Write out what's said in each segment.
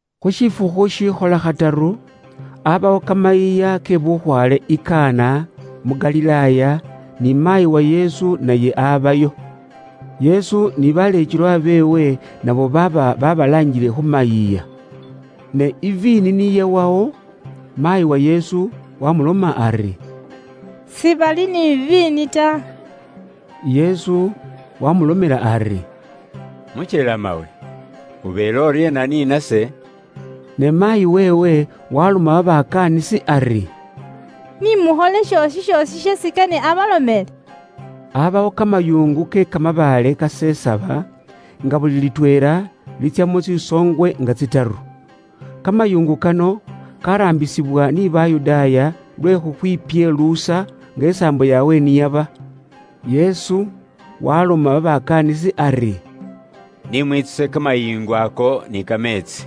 Khu shifukhu shikhola khataru, abawo kamayiiya ke bukhwaale i Kana, mu Galilaaya, ni maayi wa Yesu naye abayo. Yesu ni baleekelwa beewe nabo baaba babalaangile khu mayiiya. Ne iviini niyawawo, maayi wa Yesu wamuloma ari, “Sibali ni iviini ta.” Yesu wamulomela ari, “Mukyelemawe, ubeele uryeena ni nase?” Ne maayi weewe waloma babakaanisi ari, “Ni mukhole shoosi shoosi sheesi kane abalomele.” Aabawo kamayingu kasesaba ke kamabaale, nga buli litweela litsyamo tsisoongwe nga tsitaru. Kamayingu kano kaaraambisibwa ni Bayudaaya lwe khukhwipyeluusa, nga isaambo yaabwe ni yaba. Yesu waloma babakaanisi ari, “Ni mwitsuse kamayingu ako ni kameetsi.”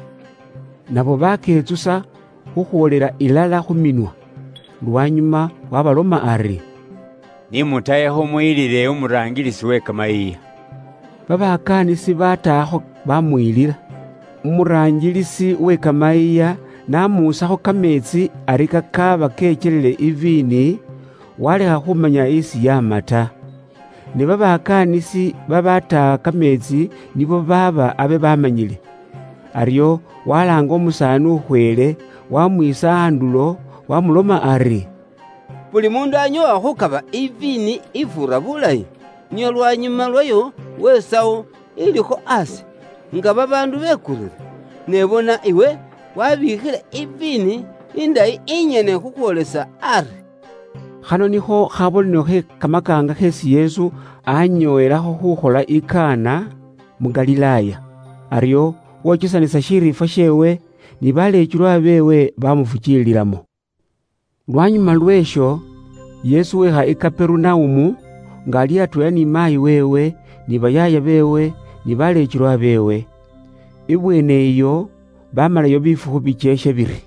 Nabo baketsusa khukhwoolela ilala khu minwa. Lwanyuma waabaloma ari, “Ni mutahekho muyilile umuraangilisi we kamayiiya.” Babakaanisi baatahakho baamuyilila. Umuraangilisi we kamayiiya n'amuusakho kameetsi ari kakaaba kekyelile iviini, waalekha khumanya isi yaama ta. Ne babakaanisi babaataha kameetsi nibo baaba abe baamanyile. Aryo walaanga umusaani ukhweele, waamwiisa andulo, waamuloma ari, “Buli muundu anyoowa khukaba iviini ifuura bulayi, nio lwanyuma lwayo wesawo ilikho aasi, nga babaandu bekurire. Ne bona iwe waabiikhile iviini indayi inyene khukhwoolesa ari.” Khano nikho khabonelo khe kamakaanga kheesi Yesu aanyoowelakho khuukholela i Kana, mu Galilaaya. Aryo wokesanisa shiriifwa sheewe, ni baleekelwa beewe baamufukiililamo. Lwanyuma lwe'sho, Yesu weekha i Kaperunaumu, nga ali atweela ni maayi weewe, ni bayaaya beewe, ni baleekelwa beewe. Ibweene iyo, baamalayo bifukhu bikyeekhe biri.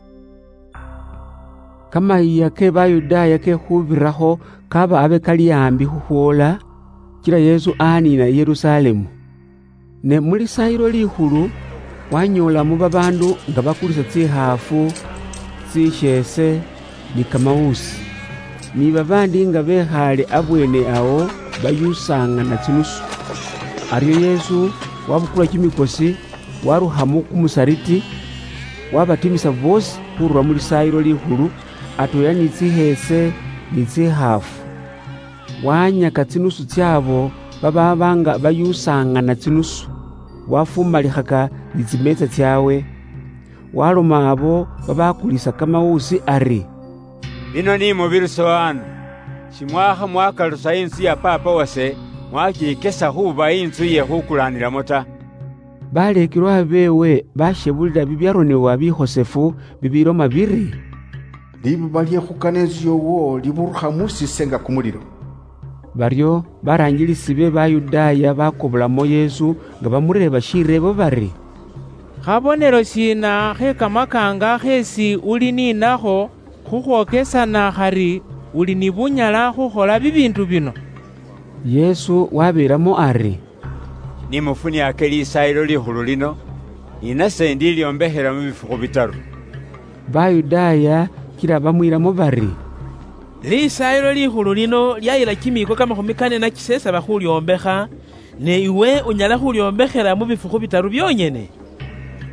Kamayiiya ke Bayudaaya ke Khuubirakho kaaba abe kali aambi khukhwoola, kila Yesu aniina i Yerusalemu. Ne mu Lisaayilo Likhulu wanyoolamo babaandu nga bakulisa tsikhaafu, tsisheese, ni kamawuusi. Ni babaandi nga bekhaale abweene awo, bayuusaŋana tsinusu. Aryo Yesu wabukula kimikosi warukhamo kumusariti, wabatimisa boosi khurura mu Lisaayilo Likhulu, atweela ni tsisheese, ni tsikhaafu. Wahanyaka tsinusu ts'abo babaaba nga bayuusaŋana tsinusu. Wafumalikhaka ni tsimeetsa tsaabwe. Waloma abo babakulisa kamawuusi ari, “Bino ni mubirusewo ano! Shimwaakha mwakalusa intsu ya Paapa wase, mwakikesa khuuba intsu ye khukulaanilamo ta.” Baleekelwa beewe bashebulila bibyaronebwa bikhosefu bibiloma biri, “Libuba lye khukana intsu yoowo liburukha mus'iise nga kumulilo.” Baryo baraangilisi be Bayudaaya bakobolamo Yesu nga bamureeba shireebo bari, “Khabonelo shiina khe kamakaanga kheesi uli ni nakho khukhwokesana khari uli ni bunyala khukhola bibiindu bino?” Yesu wabeelamo ari, “Ni mufuniaake Lisaayilo Likhulu lino, ni nase indilyombekhela mu bifukhu bitaru.” Bayudaaya kila bamwiilamo bari, “Lisaayilo Likhulu lino lyayila kimiiko kamakhumi kane na kisesaba khulyombekha, ne iwe unyala khulyombekhela mu bifukhu bitaru byonyene?”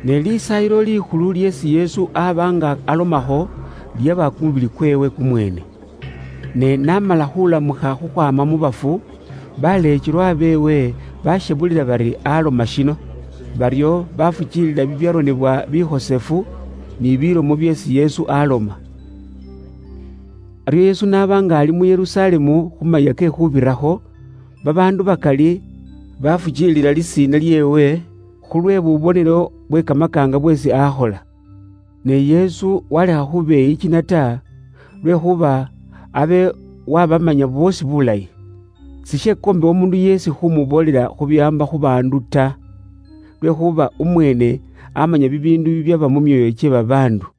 Ne Lisaayilo Likhulu lyeesi Yesu aba nga alomakho, lyaba kumubili kweewe kumweene. Ne n'amala khulamukha khukhwaama mu bafu, baleekelwa beewe bashebulila bari aloma shino. Baryo bafukiilila bibyaronebwa bikhosefu ni bilomo byeesi Yesu aloma. Aryo Yesu n'aba nga ali mu Yerusalemu khu Mayiiya ke Khuubirakho, babaandu bakali bafukiilila lisiina lyeewe, khulwe bubonelo bwe kamakaanga bweesi akhola. Ne Yesu walekha khubeyikina ta, lwekhuuba abe wabamanya boosi bulayi. Sishekombebwa umuundu yeesi khumuboolela khubiwaamba khu baandu ta, lwekhuuba umweene amanya bibiindu bibyaba mu myoyo kye babaandu.